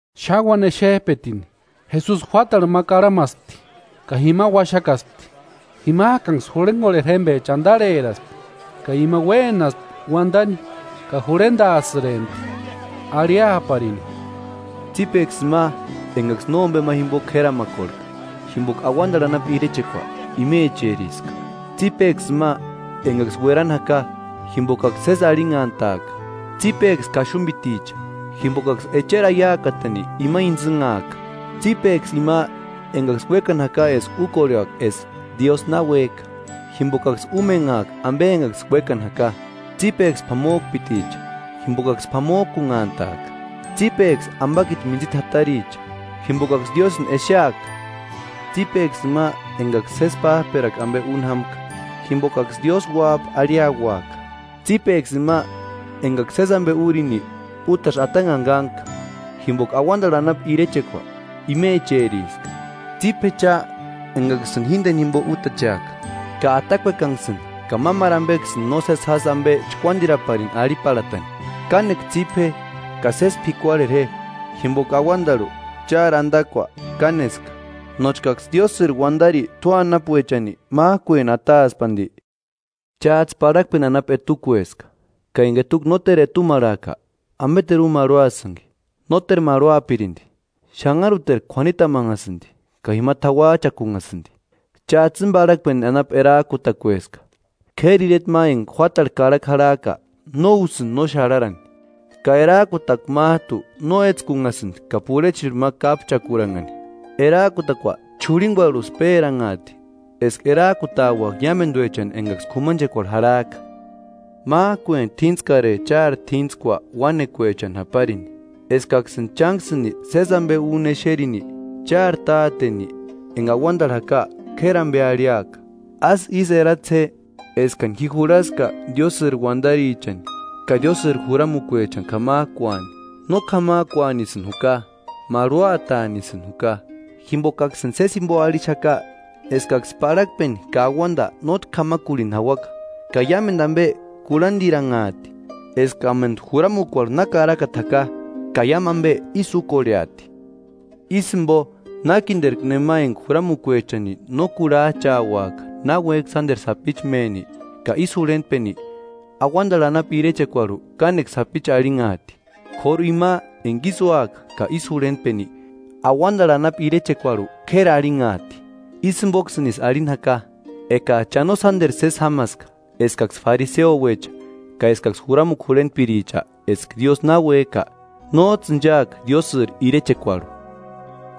Xáni uáni exep'etini, Jesusi juátarhu ma karhamaspti ka jima uaxakaspti, jimak'anksï jurhenkorheri jémpecha antarheraspti, ka ima uénaspti uantani ka jurhentaasïrempti arhiaparini: “Tsípeksï ima enkaksï nómpe ma jimpo k'éramakorhek'a, jimpoka auantarhu anapu irechekua imecheriska” “Tsípeksï ima enkaksï uerani jaka, jimpokaksï sési arhinhantaaka.” “Tsípeksï kaxumpiticha, jimpokaksï echeri aiakatani ima intsïnhaaka”. “Tsípeksï ima enkaksï uékani jaka eska úkorheaka eska Diósï na uék'a, jimpokaksï úmenhaaka ampe enkaksï uékani jaka.” “Tsípeksï p'amop'iticha, jimpokaksï p'amok'unhantaaka.” “Tsípeksï ampakiti mintsita jataricha, jimpokaksï Diósïni exeaka.” “Tsípeksï ima enkaksï sési páp'erakua ampe úni jámka, jimpokaksï Diósï uáp'a arhiauaka.” “Tsípeksï ima enkaksï sési ampe úrini, útasï atanhani kánhka, jimpoka auantarhu anapu irechekua imecheriska.” “Tsípe je cha enkaksïni jínteni jimpo útacheaka ka atakuekanksïni ka mámaru ampeksïni nósesi jásï ampe chkuántiraparini arhiparhatani.” Kánekua tsípe je, ka sési p'ikuarhera je, jimpoka auantarhu chári antakua káneska; nóchkaksï Diósïri uantari tua anapuechani mák'ueni ataaspi anti. “Cháts'ï parhakpeni anapu etukueska, ka enka etukua nóteru etumarhaaka, ¿Ampeteru úni marhuasïnki? Nóteru marhuapirinti, xanharuterku k'uanitamanhasïnti ka jima t'auach'akunhasïnti.” “Cháts'ï íni parhakpeni anapu erak'utakueska; k'éri ireta ma enka juátarhu karhakua jarhak'a no úsïnti no xarharani. Ka erak'utakua mát'u no étskunhasïnti ka purhechirhu ma kápchakuranhani, erak'utakua ch'urhinkuarhusï péranhat'i eska erak'utauaka iámentuechani enkaksï k'umanchekuarhu jarhak'a. Mák'ueni t'íntskare chári t'íntskua uánekuechani japarini, eskaksïni chánksïni sési ampe úni exerini, chári Táteni enka auantarhu jaka k'éri ampe arhiaka.” “Ásï ísï eratse je eskani ji jurhaska Diósïri uantarichani ka Diósïri juramukuechani k'amak'uani, no k'amak'uanisïni juka, marhuataanisï juka. Jimpokaksïni sési jimpo arhixaka eskaksï parhakpeni ka auanta nótki k'amakurhini jauaka, ka iámentu ampe kurhadiranhaati eskamentu juramukuarhu na karakata jaka, ka iámu ampe ísï úkorheati. Ísï jimpo nákinterku nema enka juramukuechani no kurhach'auaka náuek'i sánteru sapichu méni, ka ísï jurhentpeni, auantarhu anapu irechekuarhu kánekua sapichu arhinhaati; k'óru ima enka ísï úaka ka ísï jurhentpeni, auantarhu anapu irechekuarhu k'éri arhinhaati.” “Ísï jimpoksïnisï arhini jaka, ekats'ï cha no sánteru sési jámaska eskaksï fariseuecha ka eskaksï juramukua jurhentpiricha, eska Diósï na uék'a, nóts'ï inchaaka Diósïri irechekuarhu.”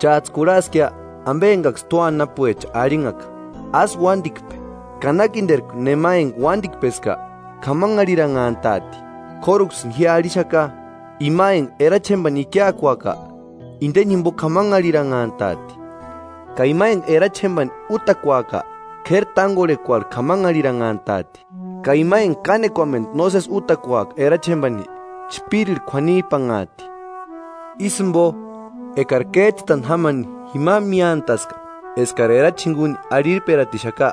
“Cháts'ï kurhaskia ampe enkaksï tua anapuecha arhinhaka: ‘Ásï uántikpe, ka nákinterku nema enka uántikpeska, k'amanharhiranhant'aati.’ K'óruksïni ji arhixaka: Ima enka erachi jémpani ikiakuaka, inteni jimpo k'amanharhiranhant'aati, ka ima enka erachi jémpani útakuaka, k'éri tánkorhekuarhu k'amanharhiranhant'aati, ka ima enka kánekuamentu nósesi útakuaka erachi jémpani, chpírirhu k'uanip'anhaati.” “Ísï jimpo, ekari kéts'ïtani jámani jima míantaska eskats'ï erachi jinkuni arhirperatixaka,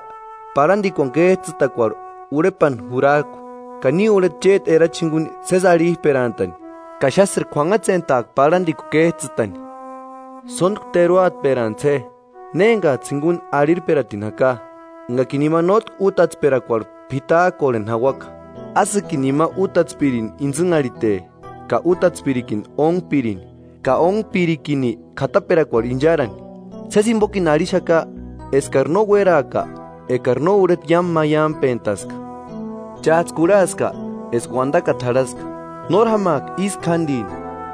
parhantikuani kéts'ïtakuarhu urhepani jurak'u, ka ni urheta chéti erachi jinkuni sési arhip'erantani ka xásïri k'uanhatsentaaka parhantikua kéts'ïtani.” “Sóntku teruatperantsï je ne enkats'ï jinkuni arhirperatini jaka, enkakini ima nótki útatsperakuarhu p'itak'orheni jauaka, ásïkini ima útatspirini intsïnharhite, ka útatspirikini ónhpirini, ka ónhpirikini k'ataperakuarhu incharani. Sési jimpokini arhixaka eskari no uéraaka ekari no urheta iámu maiampentaska.” “Cháts'ï kurhaska eska uantakata jarhaska: ‘Nóri jámaaka ísku jántini.’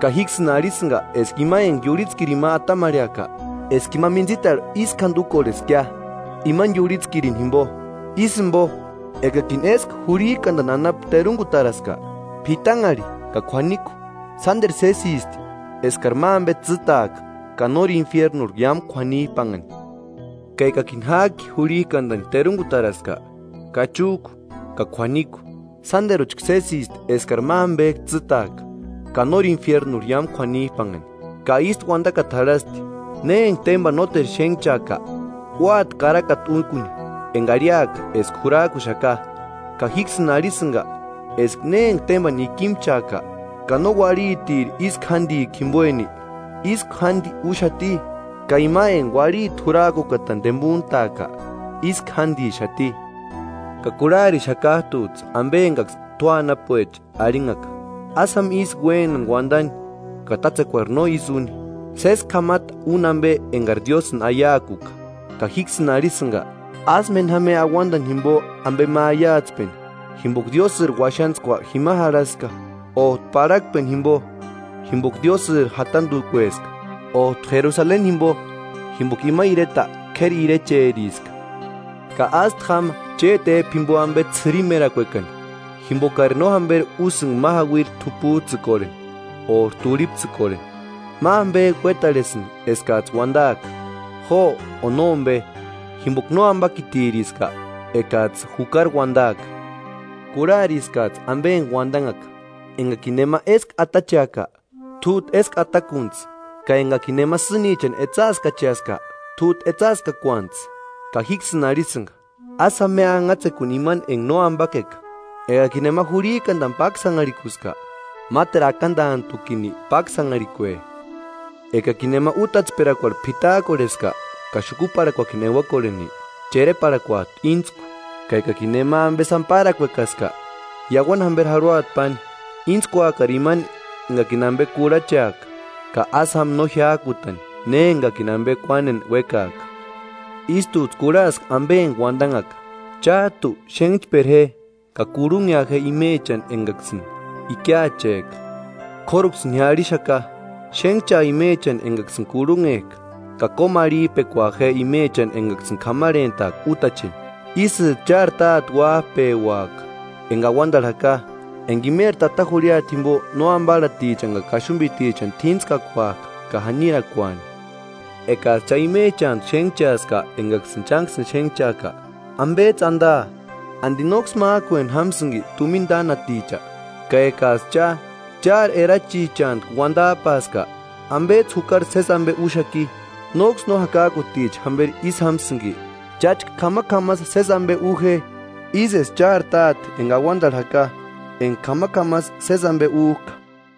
Ka jíksïni arhisïnka eska ima enka iurhitskirini ma atamarheaka, eska ima mintsitarhu ísku jánti úkorheskia, imani iurhitskirini jimpo.” “Ísï jimpo, ekakini éskua jurhik'antani anapu terunkutaraska, p'itanharhi ka k'uaniku, sánteru sésisti eskari ma ampe tsîtaaka ka nóri infiernurhu iámu k'uanip'anhani. Ka ekakini ják'i jurhik'antani terunkutaraska, kachuk'u ka k'uaniku, sánteruchka sésisti eskari ma ampek'u tsîtaaka ka nóri infiernurhu iámu k'uanip'anhani.” “Ka ístu uantakata jarhasti: ‘Ne enka témpani nóteru xénhchaaka, úati karakata úkuni enka arhiaka eska jurak'uxaka.’ Ka jíksïni arhisïnka eska ne enka témpani ikimchaaka, ka no uarhitiri ísku jántikua jimpoeni, ísku jánti úxati, ka ima enka uarhiti jurak'ukatani tempuntaaka ísku jántixati.” “Ka kurharixakat'uts'ï ampe enkaksï tua anapuecha arhinhaka: ‘Ásï jáma ísku uénani uantani ka tátsekuari no ísï úni, sési k'amata úni ampe enkari Diósïni aiakuka.’ Ka jíksïni arhisïnka: Ásï méni jáma je auantani jimpo ampe ma aiatspeni, jimpoka Diósïri uaxantskua jima jarhaska; ót'u parhakpeni jimpo, jimpoka Diósïri jatantukueska, ót'u Jerusaleni jimpo, jimpoka ima ireta k'éri irecheriska. Ka ástu jáma chéti ép'u jimpo ampe ts'ïrimerakuekani, jimpokari no jamperi úsïnka ma jauiri t'uputs'ïkorheni ori turhiptsïkorheni. Ma ampek'u uétarhesïnti eskats'ï uantaaka ‘Jo’ o ‘Nómpe’ jimpoka nóampakitiriska ekats'ï jukari uantaaka.” “Kurhariskats'ï ampe enka uantanhaka: ‘Enkakini nema éskua atacheaka, t'út'u éskua atakuntsï ka enkakini nema sînichani etsaaskacheaska, t'út'u etsaaskakuantsï.’ Ka jíksïni arhisïnka: Ásï jáma je anhatsekuni imani enka nóampakeka; ekakini nema jurhik'antani páksanharhikuska, máteru akantantukini páksanharhikue. Ekakini nema útatsperakuarhu p'itak'orheska ka xukuparhakuakini euakorheni, chereparhakuat'u íntsku. Ka ekakini nema ampe sáni párakuekaska, iauani jamperi jarhuata páni. Íntskuakari imani enkakini ampe kurhacheaka, ka ásï jáma no jiák'utani ne enkakini ampe kuáneni uékaaka.” “Ístuts'ï kurhaaska ampe enka uantanhaka: ‘Chák'u xénhchpera je ka kurhunhea je imechani enkaksï ikiach'ek'a.’ K'óruksïni ji arhixaka: Xénhchaa imechani enkaksïni kurhunhek'a ka kómu arhip'ekua je imechani enkaksïni k'amarhentka útacheni. Ísïts'ï chári Táte uáp'euaka enka auantarhu jaka, enka imeri tata jurhiata jimpo no amparhatichani ka kaxumpitichani t'íntskakuak'a ka janirakuani. Ekats'ï cha imechantku xénhchaaska enkaksïni chánksïni xénhchak'a, ¿Ampets'ï antaa? ¿Anti nóksï mák'ueni jámasïnki tumina tánaticha? Ka ekats'ï cha, chári erachichantku uantap'aska, ¿Ampets'ï jukari sési ampe úxaki? ¿Nóksï no jakak'uticha jamperi ísï jámasïnki? Cháchka k'amak'amasï sési ampe u je, ísï eska chári Táte enka auantarhu jaka enka k'amak'amasï sési ampe úk'a.”